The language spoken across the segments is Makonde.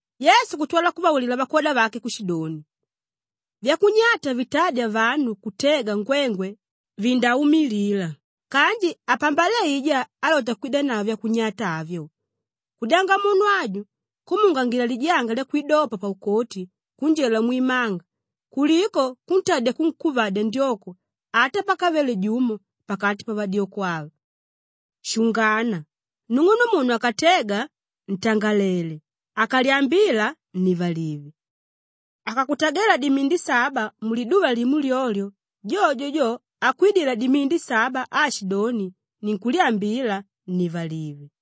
Yesu kutwala kuvaulila vakwoda vake kushidoni, “Vyakunyata vitádya vanu kutega ngwengwe vindaumilila kanji apambale aijá álota kwidanavo vyakunyata avyo! Kudyanga munu ajo kumuungangila lijanga lyakwidopa paukoti kunjela mwimanga kuliko kuntadya kunkuvadya ndyoko ata pakavele jumo pakati pavadyoko ava. Shungana! Nung'unumunu akatega, ntangalele! Akalyambila, nnivalive. Akakutagela dimindi saba muliduva limo lyolyo, jojo jo akwidila dimindi saba aashidoni, ‘Ninkulyambila,’ nnivalive.”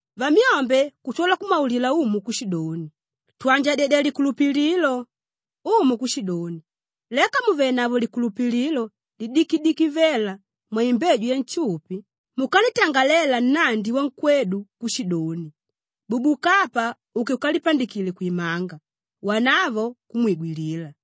Vamyombe kutwala kumwaulila Umu kushidoni, “Twanjadyedya likulupililo!” Umu kushidoni, “Leka mùvenavo likulupililo lidikidiki vela mwaimbeju yanshupi, mukanditangalela nnandi wankwedu kushidoni, ‘Bubuka apa uke ukalipandikile kwimanga,’ wanavo kumwigwilila.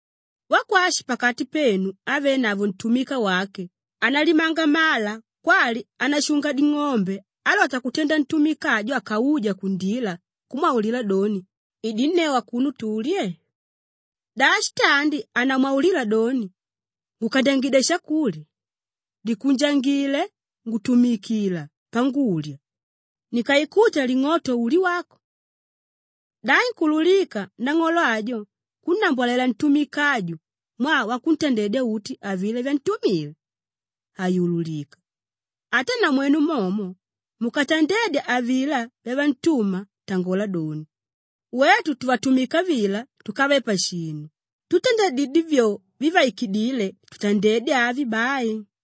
“Wakwashi pakati penu ávenavo ntumika wake ánalimanga mala kwali ánashunga ding'ombe álota kutenda ntumika ajo akauja kundila kumwaulila doni, ‘Idinneu akuno tulye’? Da shitandi hanamwaulila doni, ‘Ngukandyangidya shakulya, likunjangile, ngutumikila pangulya, nikaikuta ling'oto ulye wako’? Da inkuululika nang'olo ajo kunnambwalela ntumika aju mwaa wakutandedya uti avilá vyantumile? Hayululika. Ata namwenu momo, mukatandedya avilá vyavantuma tangola doni, ‘Wetu tuvatumika vila túkave pashinu tutandadidyé vyo vivaikidíle tutandedye avi bai.’”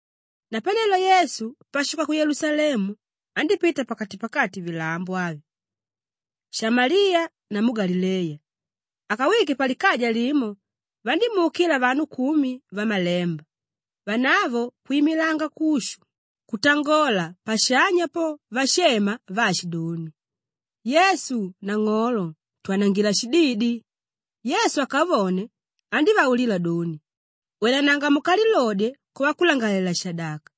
Napanelo Yesu pashuka ku Yelusalemu andípita pakati-pakati vilambo avi: Shamaliya namu Galileya. Akawike palikaja limo, vandímuukila vanu kumi vamalemba. Vanavo kwimilanga kushu kutangola pashanya po vashema vaashidoni, “Yesu, Nang'olo, twanangila shididi.” Yesu akavone, andívaulila doni, “Wenananga mukalilodye kwavakulangalalela-shadaka.”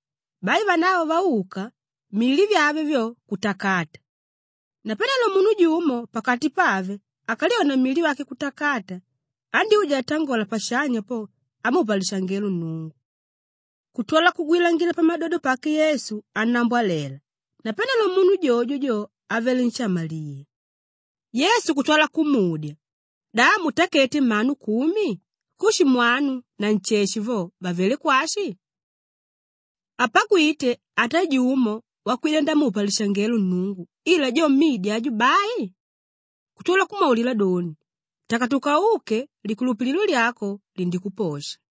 Bai vanavo vauka, mili vyave vyo, kutakata. Napanelo munu jumo pakati pave akalyone mili wake kutakata, andyúja atangola pashanya po amupa lishangelo Nnungu. Kutwala kugwilangila pamadodo pake Yesu annambwalela. Napanelo munu jojo jo, avele nshamaliya. Yesu kutwala kumudya, “Da hamutakete mmanu kumi? Kushi mwanu na nsheshe vo vavelé kwashi? Hapagwite ata jumo wakwida ndamupa lishangelo Nnungu ila jo mmidi aju bai?” Kutwala kumwaulila doni, “Takatuka uke likulupililo lyako, lindikuposha.”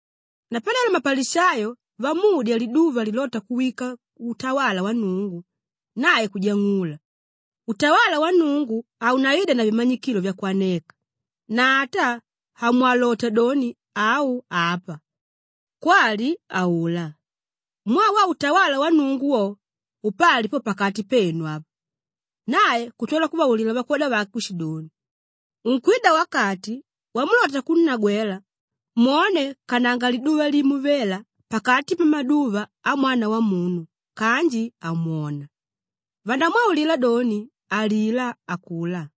Napanelo mapalishayo vamudya liduva lilóta kuwika utawala wa Nnungu, nae kujang'ula, “Utawala wa Nnungu haunaida na vimanyikilo vyakwaneka na ata hamwalota doni, ‘Au apa,’ kwali, ‘Aulá,’ mwaa wo utawala wa Nnungu wo, upali po pakati penu apa.” Nae kutwala kuvaulila vakwoda vake kushidoni, “Unkwida wakati wamulota kunnagwela mwone kananga liduva limo vela pakati pamaduva a Mwana Wamunu kanji hamwona. Vandamwaulila doni, ‘Alilá akulá,’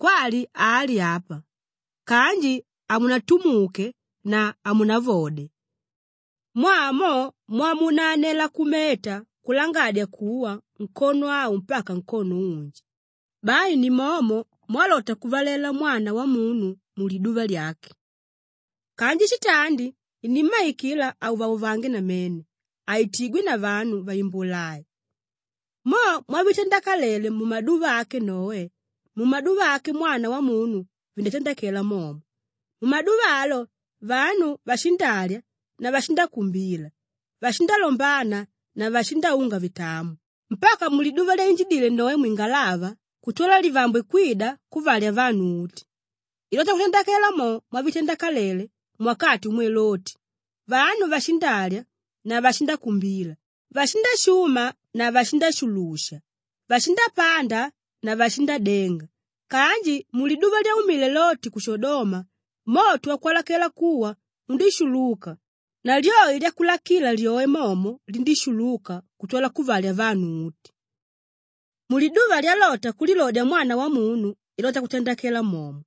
kwali ‘Ali apa,’ kanji hamunatumuke na hamunavode. Mwaa mo mwamunanela kumeta kulangadya kuwa nkono au mpaka nkono unji, bai ni momo mwalota kuvalela Mwana Wamunu muliduva lyake. Kanji shitandi inímmaikila auvauvange namene, aitigwe na vanu vaimbula ai. “Mo mwavitandakalele mumaduva ake Noe, mumaduva ake Mwana Wamunu vindatandakela momo. Mumaduva alo vanu vashindalya na vashindakumbila, vashindalombana na vashindaunga vitamo mpaka muliduva lyainjidile Noe mwingalava kutwala livambwe kwida kuvalya vanu uti. Ilota kutandakela mo mwavitandakalele muwakati umwe Loti; vanu vashindalya na vashindakumbila, vashindashuma na vashindashulusha, vashindapanda na vashindadenga kanji muliduva lyaumile Loti ku Shodoma, moto wakwalakela kuwa undíshuluka na lyoi lyakulakila lyoe momo lindíshuluka kutwala kuvalya vanu uti. Muliduva lyalota kulilodya Mwana Wamunu ilota kutandakela momo.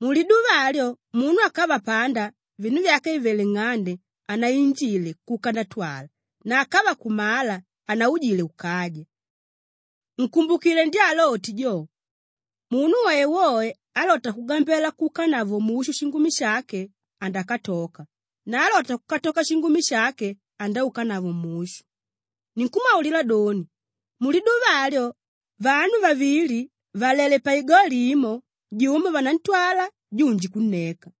Muliduva alyo munu akava panda, vinu vyake vìvele nng'ande, hanainjile kuka ndatwala na akava kumala, hanaujile kukaja. Nkumbukile ndya Loti jo. Munu woewoe álota kugambela kuukanavo mushu shingumi shake andakatoka na álota kukatoka shingumi shake andaukanavo mushu. Ninkumwaulila doni, muliduva alyo vanu vavili vàlele paigoli imo, jumo vanantwala junji kunneka.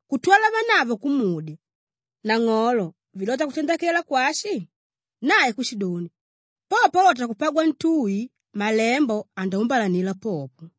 Kutwala vanavo kumudya, “Nang'olo, vilota kutandakela kwashi?” Nae kushidoni, “Po paulota kupagwa ntui, malembo andaumbalanila popo.”